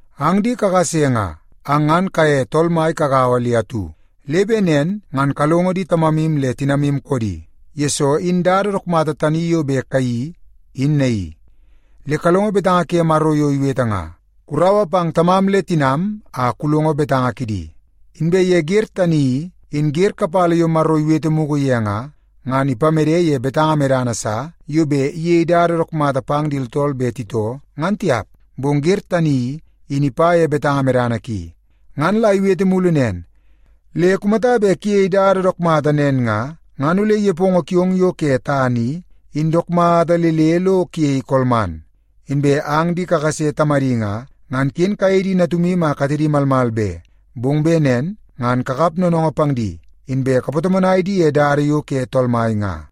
Ang di kakase nga, ang ngan kaye Tool Mai kagaua le atu, le bet nen ngan kalongo di tamamu le tinamu koodi, yesoo in dada dook mata tani yo bet kayeii, in naii. Le kalongo betanga ke Maro yo iwete nga, “Kuraua pang tamam le tinam a kulongo betanga kidi.” Inbe ye wer tani i, in wer kapala yo Maro iwete mugu ye nga, ngan ipamede ye betanga medana sa yo bet iyei dada dook mata pang di tooltool bet titoo, ngan tiap, bong wer tani i, in ipa ye betanga medana ki. Ngan la iwete mulu nen, “Le kumata bet kuyei dada dook mata nen nga, ngan ole nepongo kiong yo ke tana i, in dook mata le le lo kuyei konga.” Inbe ang di kakase tamadi nga, ngan ken kayei di natumu a katedi malmal be. Bong bet nen ngan kakap noonoongoo pang di, inbe kapatomonai di ye dada yo ke Tool Mai nga.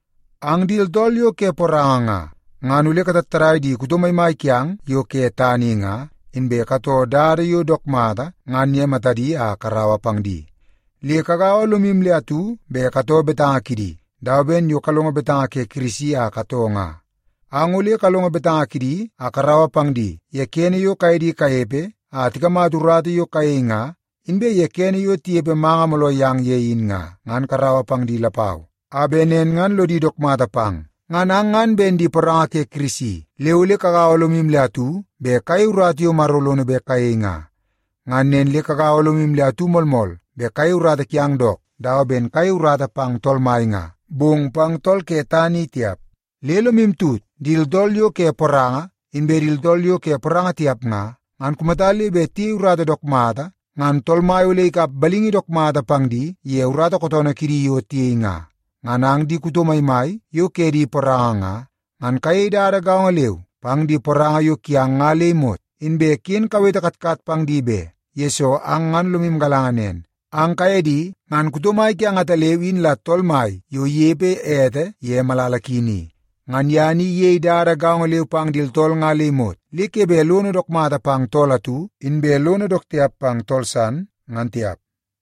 Ang di tooltool yo ke poranga nga, ngan ole katattadai di kuto maimai kiang yo ke tana i nga, inbe katoo dada yo dook mata ngan ye matadi a karaua pang di. Le kagaua lomu le atu bet katoo betanga kidi, dawa ben yo kalongo betanga ke Kirisi a katoo nga. Ang ole kalongo betanga kidi a karaua pang di ye kene yo kaye di kanepe a tikamata urata yo kayei nga, inbe ye kene yo tinepe manga mooloo yang ye in nga, ngan karaua pang di lapau, a bet nen ngan lodi dook mata pang. Ngan ang ngan ben di poranga ke Kirisi, le ole kagaua lomu le atu bet kayei urata yo Maro lono bet kayei nga. Ngan nen le kagaua lomu le atu moolmool bet kayei urata kiang dook, dawa ben kayei urata pang Tool Mai nga, bong pang tool ke tana i tiap. Le lomu tut, di tooltool yo ke poranga, inbe di tooltool yo ke poranga tiap nga, ngan kumata le bet tiyei urata dook mata, ngan Tool Mai ole ikap balingi dook mata pang di ye urata kootoonoo kidi yo tiyei nga. Ngan ang di kuto maimai yo ke di poranga nga, ngan kayei dada gaongo leu pang di poranga yo kiang nga le imot. Inbe ken kawete katkat pang di be, yesoo ang ngan lomu galanga nen, ang kaye di ngan kuto mai kiang ataleu in la Tool Mai yo inepe ete ye malala ki ni. Ngan ye ni iyei dada gaongo leu pang di tooltool nga le imot, le ke bet lono dook mata pang tool atu, inbe lono dook tiap pang tool san, ngan tiap.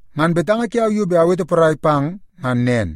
Ngan betanga kiau yo bet awete porai pang ngan nen.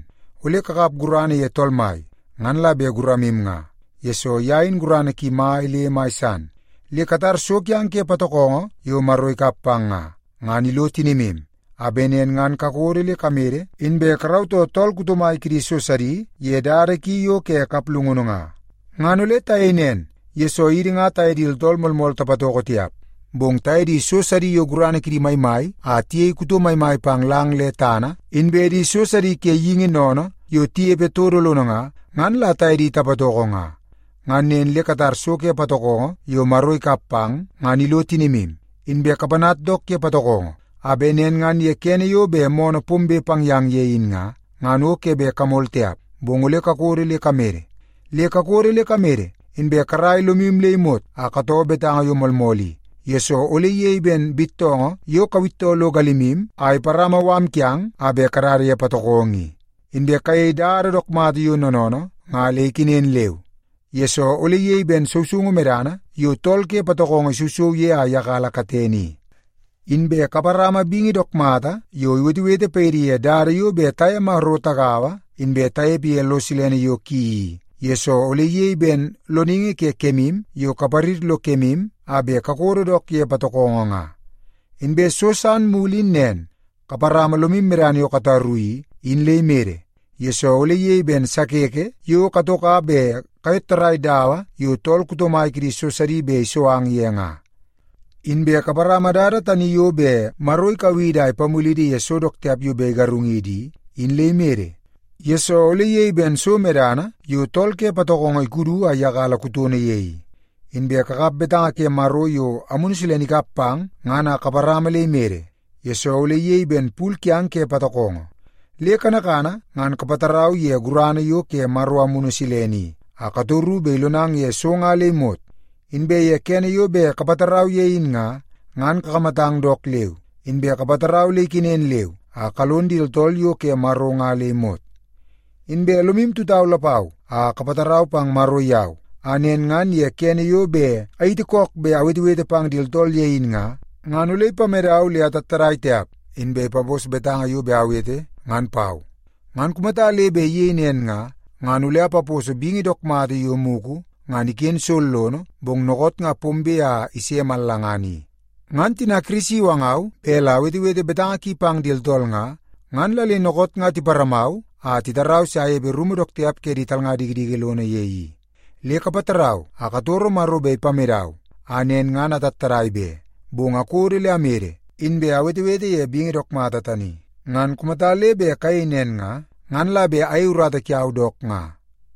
Ole kakap gurana ye Tool Mai, ngan la bet guramu nga, yesoo ye in gurana ki mai le mai san. Le katar so kiang ke patokongo yo Maro ikap pang nga, ngan ilo tinimu, a bet nen ngan kakodo le kamede, inbe karautoo tool kuto mai kidi so sidi ye dada ki yo ke kaplungunu nga. Ngan ole tayei nen, yesoo idi nga taye di tooltool moolmool tapatoko tiap. Bong taye di so sidi yo gurana kidi maimai a tiyei kuto maimai pang lang le tana, inbe di so sidi ke geingi sennene yo tinepe todo lono nga, ngan la taye di tapatoko nga. Ngan nen le katar so ke patokongo yo Maro ikap pang, ngan ilo tinimu, inbe kapanat dook ye patokongo, a bet nen ngan ye kene yo bet moonoo pombe pang yang ye in nga, ngan o ke bet kamol tiap, bong ole kakodo le kamede. Le kakodo le kamede, inbe karaia lomu le imot a katoo betanga yo moolmool i, yesoo ole iyei ben bittoongoo yo kawittoo lo galimu a iparama mala kiang a bet kadada ye patokongo i. Inbe kayei dada dook mata yo noonoonoo nga le ikenen leu, yesoo ole iyei ben sousoungu medana yo tool ke patokongo isousou ye a iyakala katene i. Inbe kaparama bingi dook mata yo iwetewete paidi ye dada yo bet taye Maro tagaua inbe tanepe ye lo silene yo ki i, yesoo ole iyei ben loningi ke kemu yo kaparir lo kemu a bet kakodo dook ye patokongo nga. Inbe so san mulu in nen, kaparama lomu medana yo kataru i, in le imede, yesoo ole iyei ben sakeke yo katoka bet kayottarai dawa yo tool kuto mai kidi so sidi bet iso ang ye nga. Inbe kaparama dada tani yo bet Maro ikau idi a ipamulidi ye so dook tiap yo bet igarung idi i, in le imede, yesoo ole iyei ben so medana yo tool ke patokongo ikudu a iyakala kutono ye i. Inbe kakap betanga ke Maro yo Amunu Silene ikap pang ngan a kaparama le imede, yesoo ole iyei ben pul kiang ke patokongo. Le kanakana ngan kapatarau ye gurana yo ke Maro Amunu Silene i, a katoru bet ilonang ye so nga le imot. Inbe ye kene yo bet kapatarau ye in nga, ngan kakamatang dook leu, inbe kapatarau le ikenen leu a kalon di tooltool yo ke Maro nga le imot. Inbe lomu tutau lapau a kapatarau pang Maro yau, a nen ngan ye kene yo bet ayiti kook bet awetewete pang di tooltool ye in nga, ngan ole ipamedau le atattadai tiap, inbe ipapos betanga yo bet awete ngan pau. Ngan kumata le bet iyei nen nga, ngan ole apaposo bingi dook mata yo mugu ngan iken sollono bong dookoot nga pombe a ise mallangana i. Ngan tina Kirisi iwangau bet la awetewete betanga ki pang di tooltool nga, ngan la le dookoot nga tiparamau a titarau se anepe rumu dook tiap ke di talnga dikidiki lono ye i. Le kapatarau a katoro Maro bet ipamedau a nen ngan atattadai be, bong akodo le amede inbe awetewete ye bingi dook mata tani. Ngan kumata le bet kayei nen nga, ngan la bet ayei urata kiau dook nga.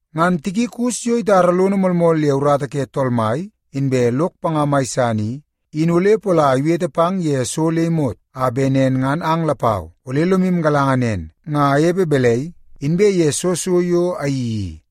Ngan Tikikus yo itara lono moolmool ye urata ke Tool Mai, inbe lok panga mai san i, in ole pola iwete pang ye so le imot, a bet nen ngan ang lapau ole lomu galanga nen nga anepe balai inbe ye soo so yo ayeii i.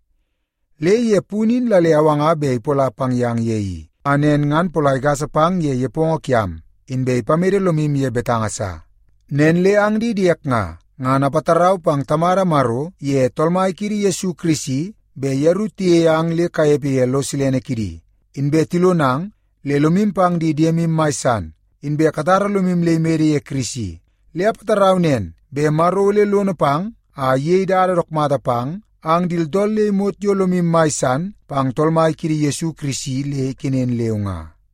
Le ye punu in la le awanga bet ipola pang yang ye i, a nen ngan pola igasa pang ye nepongo kiam, inbe ipamede lomu ye betanga sa. Nen le ang di diek nga, ngan apatarau pang Tamada Maro iye Tool Mai kiidi Yesu Kirisi bet yeru tiyei ang le kanepe ye lo silene kidi, inbe tilonang le lomu pang di diemu mai san, inbe katara lomu le imede ye Kirisi. Le apatarau nen bet Maro ole lono pang a iyei dada dook mata pang ang di tooltool le imot yo lomu mai san pang Tool Mai kiidi Yesu Kirisi le ikenen leu nga.